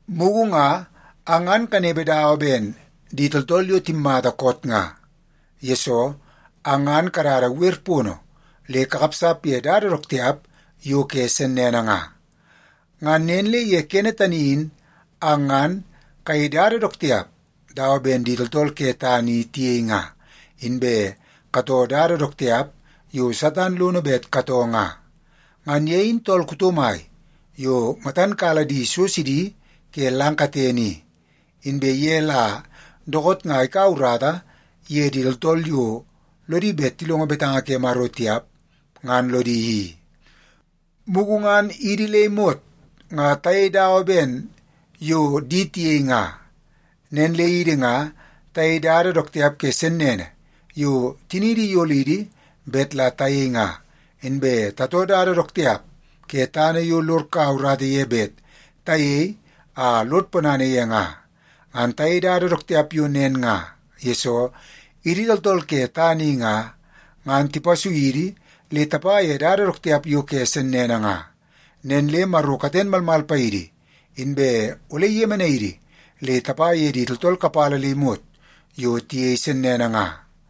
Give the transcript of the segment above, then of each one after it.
Mugu nga ang ngan kanepe dawa ben di tooltool yo timmata koot nga, yesoo ang ngan kadada wer pono le kakapsap ye dada dook tiap yo ke sennene nga. Ngan nen le ye kene tani in ang ngan kayei dada dook tiap dawa ben di tooltool ke tana i tiyei nga, inbe katoo dada dook tiap yo Satan lono bet katoo nga. Ngan ye in tool kuto mai yo matan kala di so sidi ke lang katene i, inbe ye la dookoot nga ikaua urata ye di tooltool yo lodi bet tilongo betanga ke Maro tiap, ngan lodi i. Mugu ngan idi le imot nga tayei dada dawa ben yo di tiyei nga. Nen le idi nga tayei dada dook tiap ke sennene yo tiniidi iyolidi bet la tayei nga, inbe tatoo dada dook tiap ke tana yo lod kaua urata ye bet tayei a lod ponana ye nga. Ngan tayei dada dook tiap yo nen nga, yesoo idi tooltool ke tana i nga, ngan tipasui idi le tapa ye dada dook tiap yo ke sennene nga. Nen le Maro katen malmal paidi inbe ole iyemenai idi le tapa ye di tooltool kapala le imot yo tiyei sennene nga.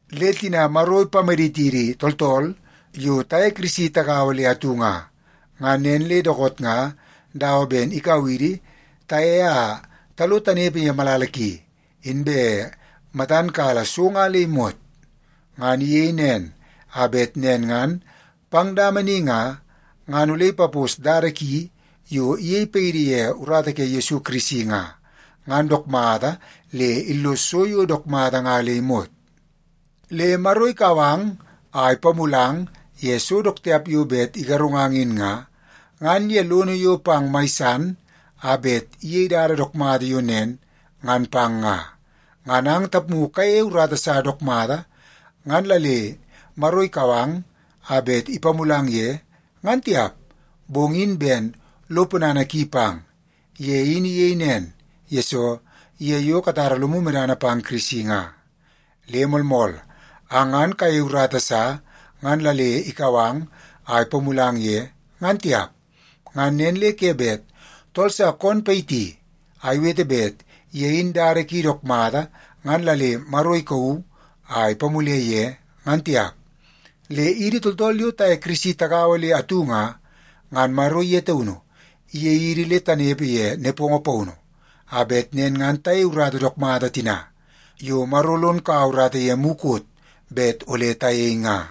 Le tina Maro ipamaditidi tooltool yo taye Kirisi tagaua le atu nga, ngan nen le dookoot nga dawa ben ikau idi taye a talo tanepe ye malala ki, inbe matan kala so nga le imot. Ngan iyei nen a bet nen ngan pang dama ni nga, ngan ole ipapos dada ki yo iyei paidi ye urata ke Yesu Kirisi nga, ngan dook mata le illos so yo dook mata nga le imot. Le Maro ikau ang a ipamulang ye so dook tiap yo bet igarungang in nga, ngan ye lono yo pang mai san a bet iyei dada dook mata yo nen ngan pang nga. Ngan ang tapmu kayeie urata sa dook mata ngan la le Maro ikau ang a bet ipamulang ye, ngan tiap, bong in ben lo ponana ki pang. Ye in iyei nen, yesoo ye yo katara lomu medana pang Kirisi nga. Le moolmool, ang ngan kayeie urata sa ngan la le ikau ang a ipamulang ye, ngan tiap. Ngan nen le ke bet tool sa koon payiti a iwete bet ye in dada ki dook mata, ngan la le Maro ikauu a ipamule ye, ngan tiap. Le idi tooltool yo taye Yesu Kirisi tagaua le atu nga, ngan Maro ye taunu iyei idi le tanepe ye nepongo paunu, a bet nen ngan tayei urata dook mata tina yo Maro lon kaua urata ye mukot bet ole tayei nga.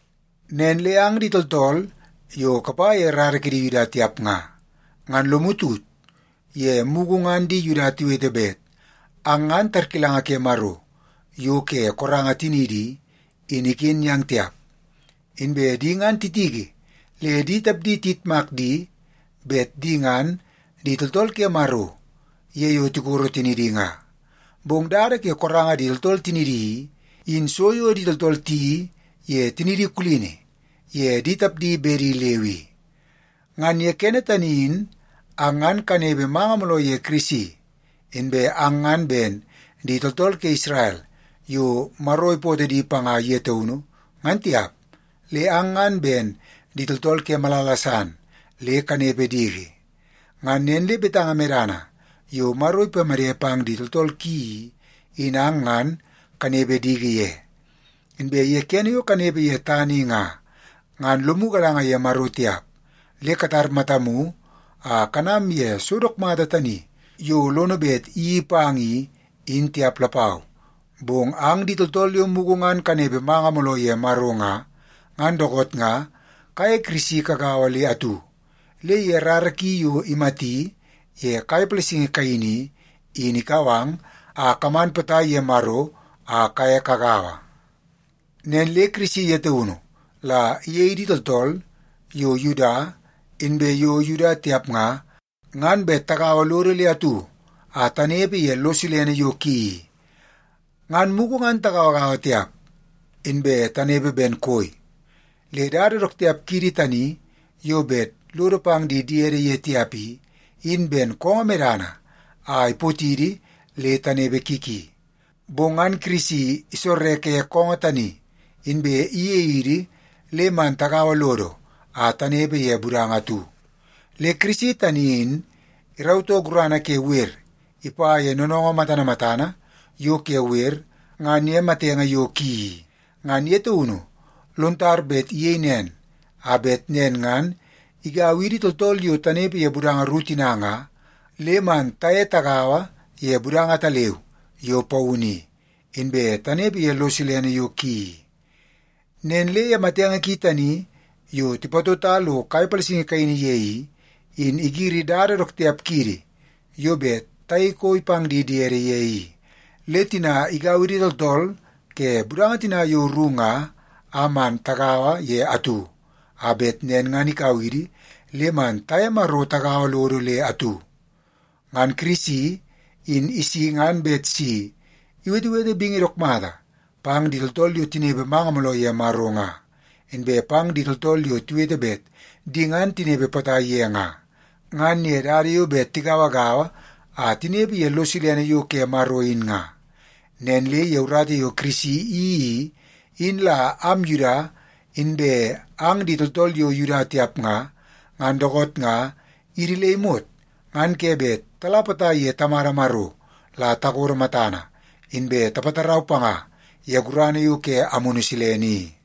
Nen le ang di tooltool yo kapa ye rara ke di Yuda tiap nga, ngan lomu tut ye mugu ngan di Yuda tiwete bet ang ngan tarkilanga ke Maro yo ke koranga tiniidi i, in iken yang tiap. Inbe di ngan titiki le di tapdi tiyitmak di bet di ngan di tooltool ke Maro ye yo tikoro tinidi nga. Bong dada ke koranga di tooltool tinidi i, in so yo di tooltool tiyeii ye tinidi kulini ye di tapdi bedi leu i. Ngan ye kene tani in ang ngan kanepe manga mooloo ye Kirisi. Inbe ang ngan ben di tooltool ke Isrel yo Maro ipootoo di panga ye taunu, ngan tiap, le ang ngan ben di tooltool ke malala san le kanepe diki. Ngan nen le betanga medana yo Maro ipamede pang di tooltool ki i, in ang ngan kanepe diki ye. Inbe ye kene yo kanepe ye tana i nga, ngan lomu galanga ye Maro tiap, le katar matamu a kanam ye so dook mata tani yo lono bet iyeii pang i, in tiap lapau. Bong ang di tooltool yo mugu ngan kanepe manga mooloo ye Maro nga, ngan dookoot nga kaye Yesu Kirisi kagaua le atu, le ye rara ki yo imati ye kai palasingi kaini i, in ikau ang a kaman potai ye Maro a kaye kagaua. Nen le Kirisi ye taunu la iyei idi tooltool yo Yuda inbe yo Yuda tiap nga, ngan bet tagaua lodo le atu a tanepe ye lo silene yo ki i. Ngan mugu ngan tagauagaua tiap, inbe tanepe ben koi. Le dada dook tiap kiidi tani yo bet lodo pang di diede ye tiap i, in ben koongoo medana a ipotidi le tanepe ki ki. Bong ngan Kirisi isorreke koongoo tani, inbe iyei idi le man tagaua lodo a tanepe ye budanga atu. Le Kirisi tani in irautoo gurana ke wer ipa ye noonoongoo matana matana yo ke wer ngan ye matenge yo ki i. Ngan ye taunu lon tar bet iyei nen, a bet nen ngan igau idi tooltool yo tanepe ye budanga ru tina nga, le man taye tagaua ye budanga ataleu yo paunu i, inbe tanepe ye lo silene yo ki i. Nen le ye matenge ki tani yo tipatota lo kai palasingi kaini ye i, in igiri dada dook tiap kiidi yo bet tayei koi pang di diede ye i. Le tina igau idi tooltool ke budanga tina yo ru nga a man tagaua ye atu, a bet nen ngan ikau idi le man taye Maro tagaua lodo le atu. Ngan Kirisi in isi ngan bet si iwetewete bingi dook mata pang di tooltool yo tinepe manga mooloo ye Maro nga, inbe pang di tooltool yo tiwete bet di ngan tinepe potai ye nga, ngan ye dada yo bet tigauagaua a tinepe ye lo silene yo ke Maro in nga. Nen le ye urata yo Kirisi iyeii i, in la am Yuda inbe ang di tooltool yo Yuda tiap nga, ngan dookoot nga idi le imot ngan ke bet tala potai ye Tamada Maro la takodo matana, inbe tapatarau panga ye gurana yo ke Amunu Silene i.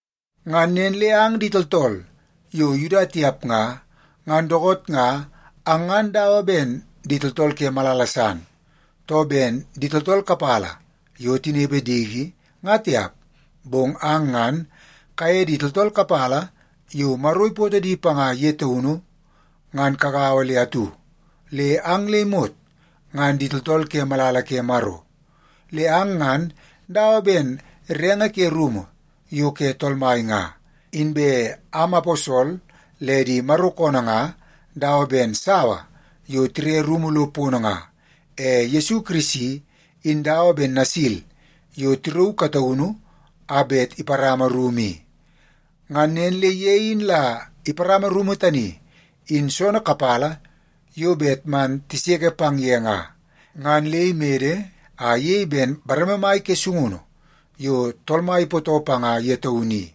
Ngan nen le ang di tooltool yo Yuda tiap nga, ngan dookoot nga ang ngan dawa ben di tooltool ke malala san, too ben di tooltool kapala yo tinepe diki, nga tiap. Bong ang ngan kaye di tooltool kapala yo Maro ipootoo di panga ye taunu, ngan kagaua le atu, le ang le imot ngan di tooltool ke malala ke Maro. Le ang ngan dawa ben renge ke rumu yo ke Tool Mai nga. Inbe am aposol le di Maro koonoo nga dawa ben sawa yo tire rumu lo pono nga. E Yesu Kirisi in dawa ben nasil yo tirauu kataunu a bet iparama rumu i. Ngan nen le ye in la iparama rumu tani in soonoo kapala yo bet man tiseke pang ye nga, ngan le imede a iyei ben bareme mai ke sungunu yo Tool Mai ipootoo panga ye taunu i.